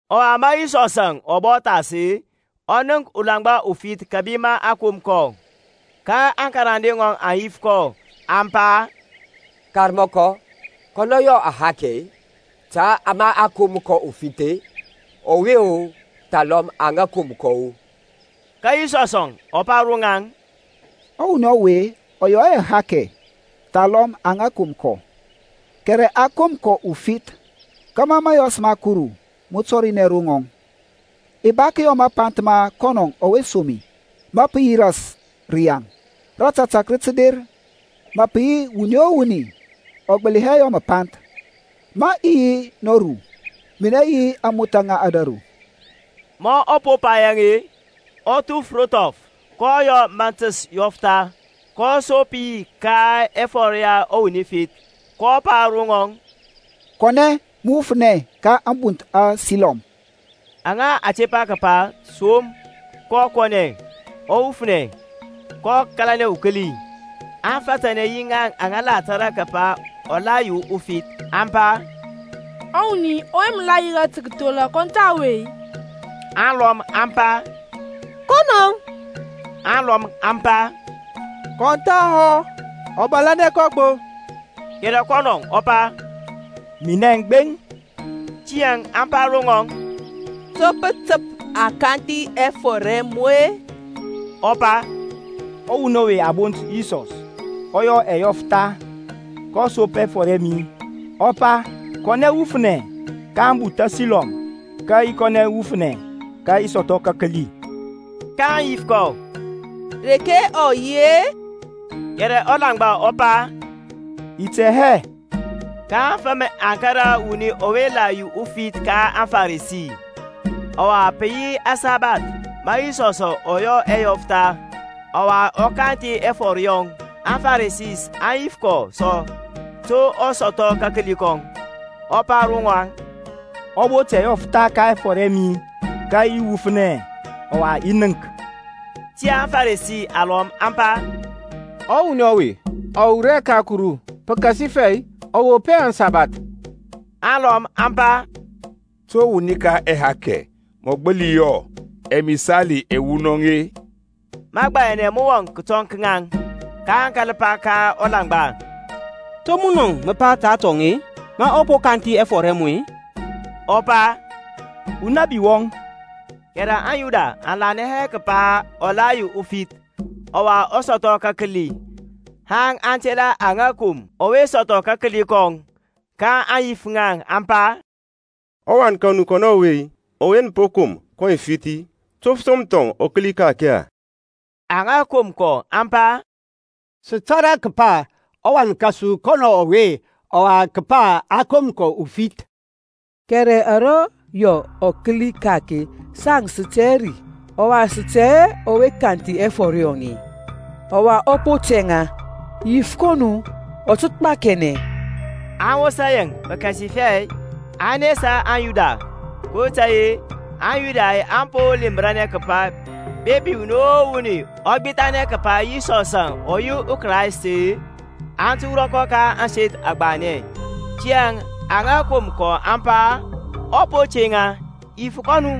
Ɔwa ma Yisɔsȧŋ ɔ bɔ thas-e, ɔ nənk ulaŋgba ufith kȧbi ma a kom kɔ. Ka aŋkarande ŋɔŋ aŋ yif kɔ, aŋ pa, Karmɔkɔ, kanɛ yɔ ahakɛ-e, ta ma a kom kɔ ufith-e, ɔwe-o, thalɔm aŋa kom kɔ-e? Ka Yisɔsȧŋ ɔ pa ro ŋaŋ, Ɔwuni ɔwe ɔ yɔ hɛ ahakɛ, thalɔm aŋa kom kɔ: kɛrɛ a kom kɔ ufith kȧmȧ mȧyɔs ma Kuru mə tɔrinɛ ro ŋɔŋ. I ba kəyɔ mapanth ma kɔnɔ ɔwe som mi, ma pə yi ras rəyaŋ: rȧtȧtȧk rə tə der, ma pə yi wuni o wuni ɔ gbəli hɛ yɔ məpanth. Ma i yi nɔru, minɛ yi ȧŋmothȧ ŋa ȧdȧru. Ma ɔ po pa yaŋ-e, ɔ thuf ro thɔf, kɔ yɔ ȧmȧntəs yɔftha, kɔ sop yi ka ɛfɔr ya ɔwuni fith. kɔ pa ro ŋɔŋ, Kɔnɛ, mə wufnɛ ka ȧŋbunth aSilɔm (aŋa a tepa kəpa, Som). Kɔ kɔnɛ, ɔ wufnɛ, kɔ kȧlanɛ ukəli. Aŋfatanɛ yi ŋaŋ aŋa tȧrȧ kəpa ɔ la yi ufith, aŋ pa, Ɔwuni ɔwe mə la yirȧ tə kəthola kɔn tha ɔwe-i? Alɔm aŋ pa, Kɔnɔŋ, alɔm aŋ pa, Kɔn thahɔ, ɔ bȧlȧnɛ kɔ gbo: kɛrɛ kɔnɔ ɔ pa, Minɛŋ gbeŋ. Tiyȧŋ aŋ pa ro ŋɔŋ, To pə təp a kanthi ɛfɔr ɛ mu-e? Ɔ pa, Ɔwuni ɔwe a bont Yisɔs ɔ yɔ ɛyɔftha, kɔ sop ɛfɔr ɛ mi, ɔ pa, Kɔnɛ wufnɛ ka ȧŋbunth aSilɔm, ka i kɔnɛ wufnɛ ka i sɔthɔ kəkəli. kaŋ yif kɔ, Reke ɔ yi-e? Kɛrɛ ɔlaŋgba ɔ pa, I tɛ hɛ. Ka aŋfəm aŋ kȧrȧ ɔwuni ɔwe la yi ufith ka aŋFarisi. Ɔwa pə yi aŋsabath ma Yisɔsȧŋ ɔ yɔ ɛyɔftha, ɔwa ɔ kanthi ɛfɔr yɔŋ. AŋFarisi aŋ yif kɔ sɔ to ɔ sɔthɔ kakəli kɔŋ. Ɔ pa ro ŋaŋ, Ɔ bot ɛyɔftha ka ɛfɔr ɛ mi, ka i wufnɛ, ɔwa i nənk. Tiyȧŋ aFaresi alɔm aŋ pa, Ɔwuni ɔwe ɔ wur hɛ ka Kuru, pəkasifɛ ɔ wop hɛ aŋsabath. Alɔm aŋ pa, To wuni ka ahakɛ mɔ gbəli yɔ ɛmisali ɛwunɔŋ-e? Məgbayanɛ mə wɔŋ kətɔŋ ka ŋaŋ. kaŋ kȧl pa ka ɔlaŋgba, To munɔŋ mə pa ta atɔŋ-e, ma ɔ po kanthi ɛfɔr ɛ mu-e? Ɔ pa, Unabi wɔŋ. Kɛrɛ aŋYuda aŋ lanɛ hɛ kəpa ɔ la yi ufith, ɔwa ɔ sɔthɔ kəkəli, haŋ aŋ tela aŋa kom ɔwe sɔthɔ kakəli kɔŋ. kaŋ yif ŋa aŋ pa, Ɔwan ka nu kɔnɔ ɔwe-i, ɔwe nə pa a kom kɔ ufith-i, to pə som thɔŋ ɔ kəli ka-ake-e? Aŋa kom kɔ aŋ pa, Sə tȧrȧ kəpa ɔwan kȧsu kɔnɔŋ ɔwe ɔwa kəpa a kom kɔ ufith: kɛrɛ ara yɔ ɔ kəli ka-ake, saŋ sə tɛ hɛ ri: ɔwa sə tɛ hɛ ɔwe kanthi ɛfɔr yɔŋ-e: ɔ po tɛŋa, yif kɔ nu; ɔ tə gbakiɛnɛ. Aŋ wosa yaŋ-e, pəkasifɛ aŋ nesa aŋYuda: kotȧy-e aŋYuda aŋ po lemranɛ kəpa, bepi wuni o wuni ɔ gbithanɛ kəpa Yisɔsȧŋ ɔ yi ɔKraist-e aŋ tə wurɔ kɔ ka ȧŋseth agbanɛ. Tiyȧŋ aŋa kom kɔ aŋ pa, Ɔ po tɛŋa: yif kɔ nu.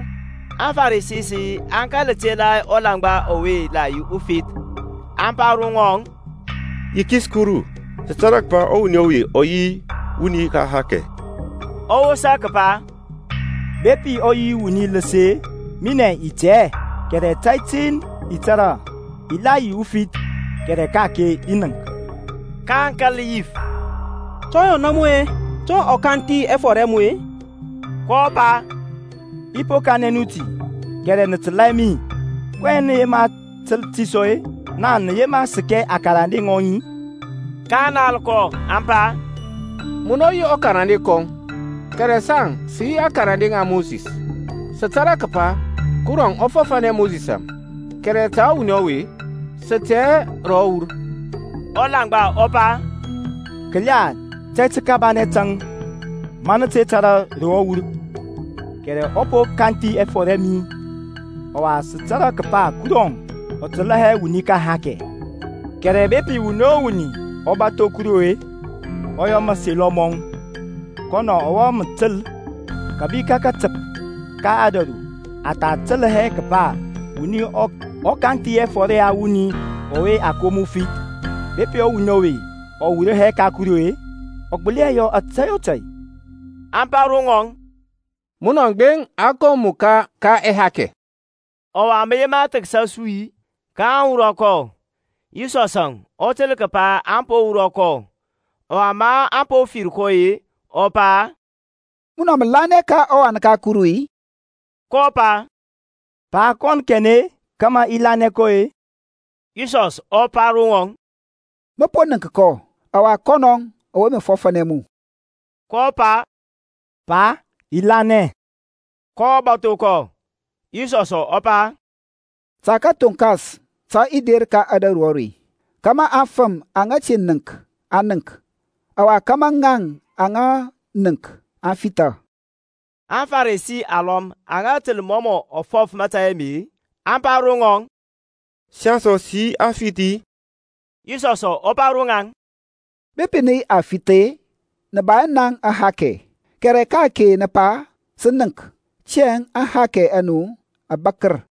AŋFarisi aŋ kȧl tela ɔlaŋgba ɔwe la yi ufith, aŋ pa ro ŋɔŋ, Yikis Kuru: sə tȧrȧ kəpa ɔwuni ɔwe ɔ yi wuni ka ahakɛ. Ɔ wosa kəpa, Bepi ɔ yi wuni ləs-e, minɛŋ i tɛ hɛ, kɛrɛ tȧy tin i tȧrȧ, i la yi ufith kɛrɛ ka-ake i nənk. kaŋ kȧl yif, To ɔ yɔna mu-e, to ɔ kanthi ɛfɔr ɛ mu-e? kɔ pa, I po kanɛ nu ti, kɛrɛ nə təlȧ hɛ mi: kɔyɛŋ nə yema təl ti sɔ-e, naŋ nə yema səkɛ akarande ŋɔŋ-i? kaŋ nal kɔ, aŋ pa, Munɔ yi ukarande kɔŋ, kɛrɛ saŋ sə yi akarande ŋa Mosis. Sə tȧrȧ kəpa Kurɔŋ ɔ fɔfȧnɛ Mosisȧŋ, kɛrɛ ta ɔwuni ɔwe, sə tɛ hɛ ro ɔ wur. Ɔlaŋgba ɔ pa, Kəla, tȧy təkabanɛ tȧŋ, ma nə te tȧrȧ ro ɔ wur, kɛrɛ ɔ po kanthi ɛfɔr ɛ mi. Ɔwa sə tȧrȧ kəpa Kurɔŋ ɔ təlȧ hɛ wuni ka ahakɛ; kɛrɛ bepi wuni o wuni ɔ bȧtho Kuru-e, ɔ yɔ mȧselɔ mɔŋ, kɔnɔ mɔ təlȧ. Kəbi ka katəp ka ȧdȧru a tha təl hɛ kəpa wuni ɔ kanthi ɛfɔr ya wuni ɔwe a kom ufith. Bepi ɔwuni ɔwe ɔ wur hɛ ka Kuru-e, ɔ gbəli hɛ yɔ tȧy o tȧy. Aŋ pa ro ŋɔŋ, Munɔŋ gbeŋ a kom mu ka ɛhakɛ, ɔwa mə yema thəksa su-i? kaŋ wurɔ kɔ. Yisɔsȧŋ ɔ təl kəpa a po wurɔ kɔ: ɔwa ma ɔ fir kɔ-e, ɔ pa, Munɔ mə lanɛ ka ɔWan ka Kuru-i? kɔ pa, Pa, kɔn kanɛ-e, kȧmȧ i lanɛ kɔ-e? Yisɔs ɔ pa ro ŋɔŋ, Mə po nənk kɔ, ɔwa kɔnɔŋ ɔwe mə fɔfȧnɛ mu. kɔ pa, Pa, i lanɛ. Kɔ bȧtho kɔ. Yisɔsȧŋ ɔ pa, Ta kathoŋkas tə i der ka ȧdȧru are, kȧmȧ aŋfəm aŋa te nənk aŋ nənk; ɔwa kȧmȧ ŋaŋ aŋa nənk aŋ fitha. AŋFarisi alɔm aŋa təl mɔ mɔ fɔf mȧtȧy ame, aŋ pa ro ŋɔŋ, Saŋ sɔ sə yi afith-i? Yisɔsȧŋ ɔ pa ro ŋaŋ, Bepi nə yi afith-e, nə ba hɛ naŋ ahakɛ; kɛrɛ ka-ake nə pa, Sə nənk; tiyȧŋ aŋhakɛ a nu aŋ bȧkər.